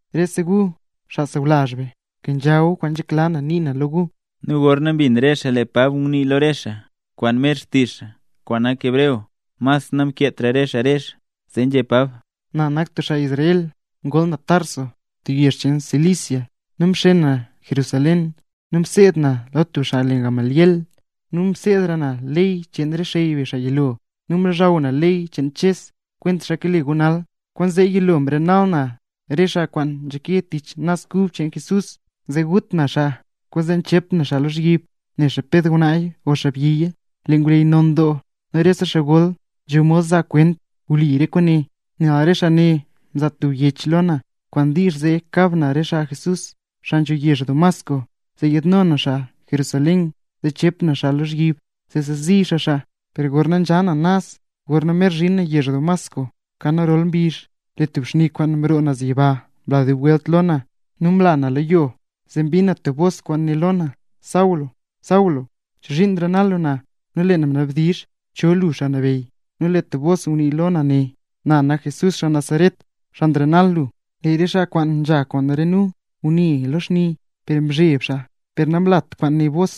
—Rese gu, xaa sawlazh be, kenzha gu kwaan nzhekla na nii na lo gu. Nu gorna mbin re xaa lee Pab ngunii lo re xaa kwaan mer xtizh xaa, kwaan nak hebreo, mas namkeetra re xaa rezh. Zee Pab nzhé: —Na nak tub xaa Israel. Ngol na Tarso, tub yezh cheen Cilicia, per mxen na nee Jerusalén, nu mseed na lo tub xaa le Gamaliel, nu mseedra na rese ley cheen re xey be xaa yilo. Nu mlozhaw na ley cheen Ches, kwentaxa kale gu nal. Kwaanzee yilo mrenal na re xaa kwaan nzhake tich Naz Kub cheen Jesús, zee gut na xaa. Kwaanzee mchep na xaa lozhyib, nexa ped ngwnaaya o xaabyiya. Lee ngwleyy non doo nu rese xaa gol nzho mod zaa xaa kwent wli re kwaane. Nel re xaa ne mzaa tub yech lo na kwaan diizh zee kab na re xaa Jesús, xaa nzho yezh Damasco, zee yaadno na xaa Jerusalén nu chep na xaa lozhyib, zee chezi xaa xaa. ’Per gorna nzha na naz gorna mer zhin na yezh Damasco, kan rolta mbizh, lee tub xni kwaan mroo naz yiba mla dub welt lo na, nu mla na lo yo. Zee mbin na tub bos kwaan nguné lo na: “Saulo, Saulo, ¿chozhiin nrenal lu na?” Nu lee na mnabdizh: “¿Cho lu Xaa Nabeyy?” Nu lee tub bos ngunii lo na né: “Na nak Jesús xaa Nazaret, xaa nrenal lu”. Lee re xaa kwaan nzha kwaan re nu ngune xaa lo xni nu mzheb xaa per namlat kwaan né bos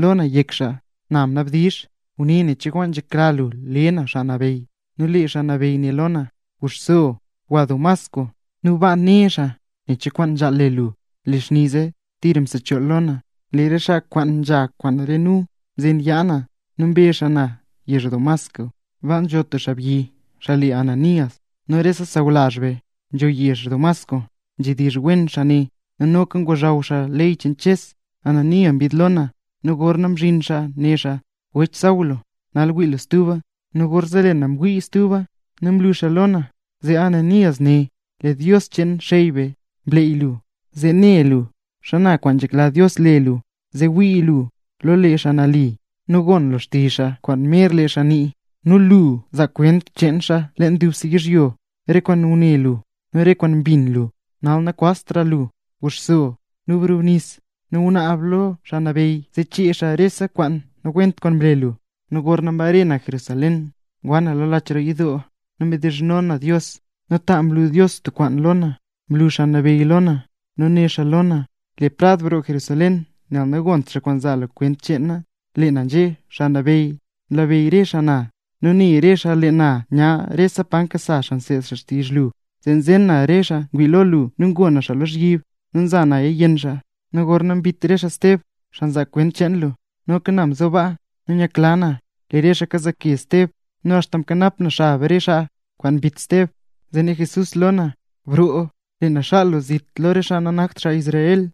lo na yek xaa. Na mnabdizh: “Guné nen cho kwaan nzhekla lu le na Xaa Nabeyy”. Nu lee Xaa Nabeyy né lo na: “Guxso gwa Damasco. Nu baa né xaa nen cho kwaan nzhaal le lu.” Lee xni zee tira msechool lo na, lee re xaa kwaan nzha kwaan re nu mzen yaa na nu mbe xaa na yezh Damasco. ’Baa nzho tub xaabyi xaa le Ananías, nu rese xaa sawlazh be, xaa nzho yezh Damasco nzhedizh wen xaa xaa ne. Nu noka ngozhaw xaa ley cheen Ches. Ananías mbid lo na, nu gorna mzhin xaa né xaa: “Wech Saulo, nal wii lu stuba”. Nu gorzee lee na mwii stuba, nu mlu xaa lo na. Zee Ananías né: “Lee Dios cheen re xey be mleey lu, zee ne lu xana kwaan nzhekla Dios le lu, nu zee wii lu lo lee Xaa Nali, nu gon lu xtizh xaa kwaan mer lee xaa nii. Nu lu zaa kwent cheen xaa leen dubse yizhyo, re kwaan ngune lu, nu re kwaan mbin lu. Nal nakwaztra lu. Guxso, nu brubnis, nu gunaab lo Xaa Nabeyy zee chee xaa rese kwaan nawent kwaan mle lu.” ’Nu gorna mbare na Jerusalén, ngwa na lo lach roo yidoo, nu mdizhno na Dios, nu ta mlu Dios tub kwaan lo na. Mlu Xaa Nabeyy lo na, nu né xaa lo na: “Le prad broo Jerusalén, nel nagont xaa kwaan zaa lu kwent cheen na”. Lee na nzhé: “Xaa Nabeyy, nlabeyy re xaa na, nu ne re xaa lee na nya rese pa nkasa nu nseed nu xtizh lu, zee mzen na re xaa ngwii lo lu nu ngo na xaa lozhyib, nu mza naya yenn xaa. Nu gorna mbit re xaa Steb, xaa mzaa kwent cheen lu, noka na mzo baa, nu nyakla na lee re xaa kazaake Steb, nu axta mkanap na xab re xaa kwaan mbit Steb.” Zee né Jesús lo na: “Broo, lee na xaal lu zit lo re xaa nanakt xaa Israel”.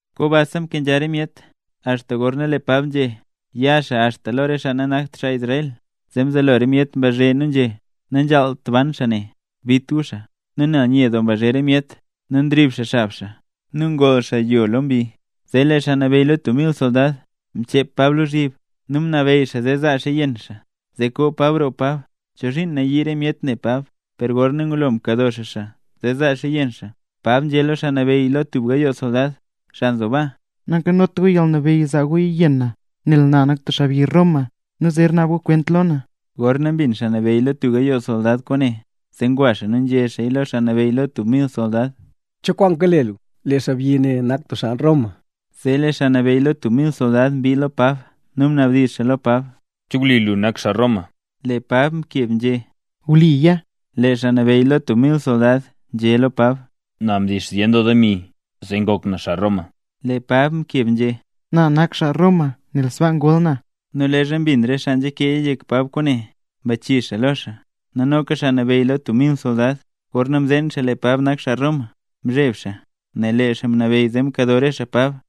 Kombasa mkenzha re myet axta gorna lee Pab nzhé, ya xaa axta re xaa nanakt xaa Israel; zee mzelo re myet mbazhe nu nzhé: —¡Nanzhaalt ban xaa ne! ¡Bit gu xaa! Nu nel nye doo mbazhe re myet nu nrib xaa xab xaa, nu ngoll xaa yo lo mbi, zee lee xaa nabeyy lo tub mil soldad, mchep Pab lozhyib, nu mnabeyy xaa zee zaa xaa yenn xaa, zee koo Pab roo Pab chozhiin nayii re myet ne Pab. Per gorna ngulola mkado xaa xaa zee zaa xaa yenn xaa, Pab nzhé lo xaa nabeyy lo tub gayoo soldad, xaa nzo baa: —Nankanot gu yalnabeyy zaa gu yenn na, nel na nak tub xaabyi Roma nu zer naab gu kwent lo na. Gorna mbin xaa nabeyy lo tub gayoo soldad kwaane, zee ngwa xaa nu nzhé xaaya lo xaa nabeyy lo tub mil soldad: —¿Cho kwaan kale lu? Lee xaabyi ne nak tub xaa Roma. Zee lee xaa nabeyy lo tub mil soldad mbii lo Pab, nu mnabdizh xaa lo Pab: —¿Che wli lu nak xaa Roma? Lee Pab mkeb nzhé: —Wliya. Lee xaa nabeyy lo tub mil soldad nzhé lo Pab: —Na mdix zyen doo demi zee ngok na xaa Roma. Lee Pab mkeb nzhé: —Na nak xaa Roma nel sbaa ngol na. Nu leezha mbin re xaa nzha keeya yek Pab kwaane, mbachii xaa lo xaa; nu noka xaa nabeyy lo tub mil soldad, gorna mzeen xaa lee Pab nak xaa Roma, mzheb xaa nel lee xaa mnabeyy zee mkado re xaa Pab.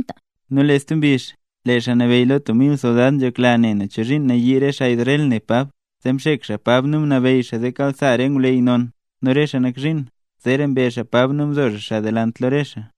Nu lee stub mbizh, lee xaa nabeyy lo tub mil soldad nzhekla nen chozhiin nayii re xaa Israel ne Pab, zee mxek xaa Pab nu mnabeyy xaa zee kasa xaa re ngwleyy non nu rese xaa nak zhiin. Zeera mbe xaa Pab nu mzo xaa xaa delant lo re xaa.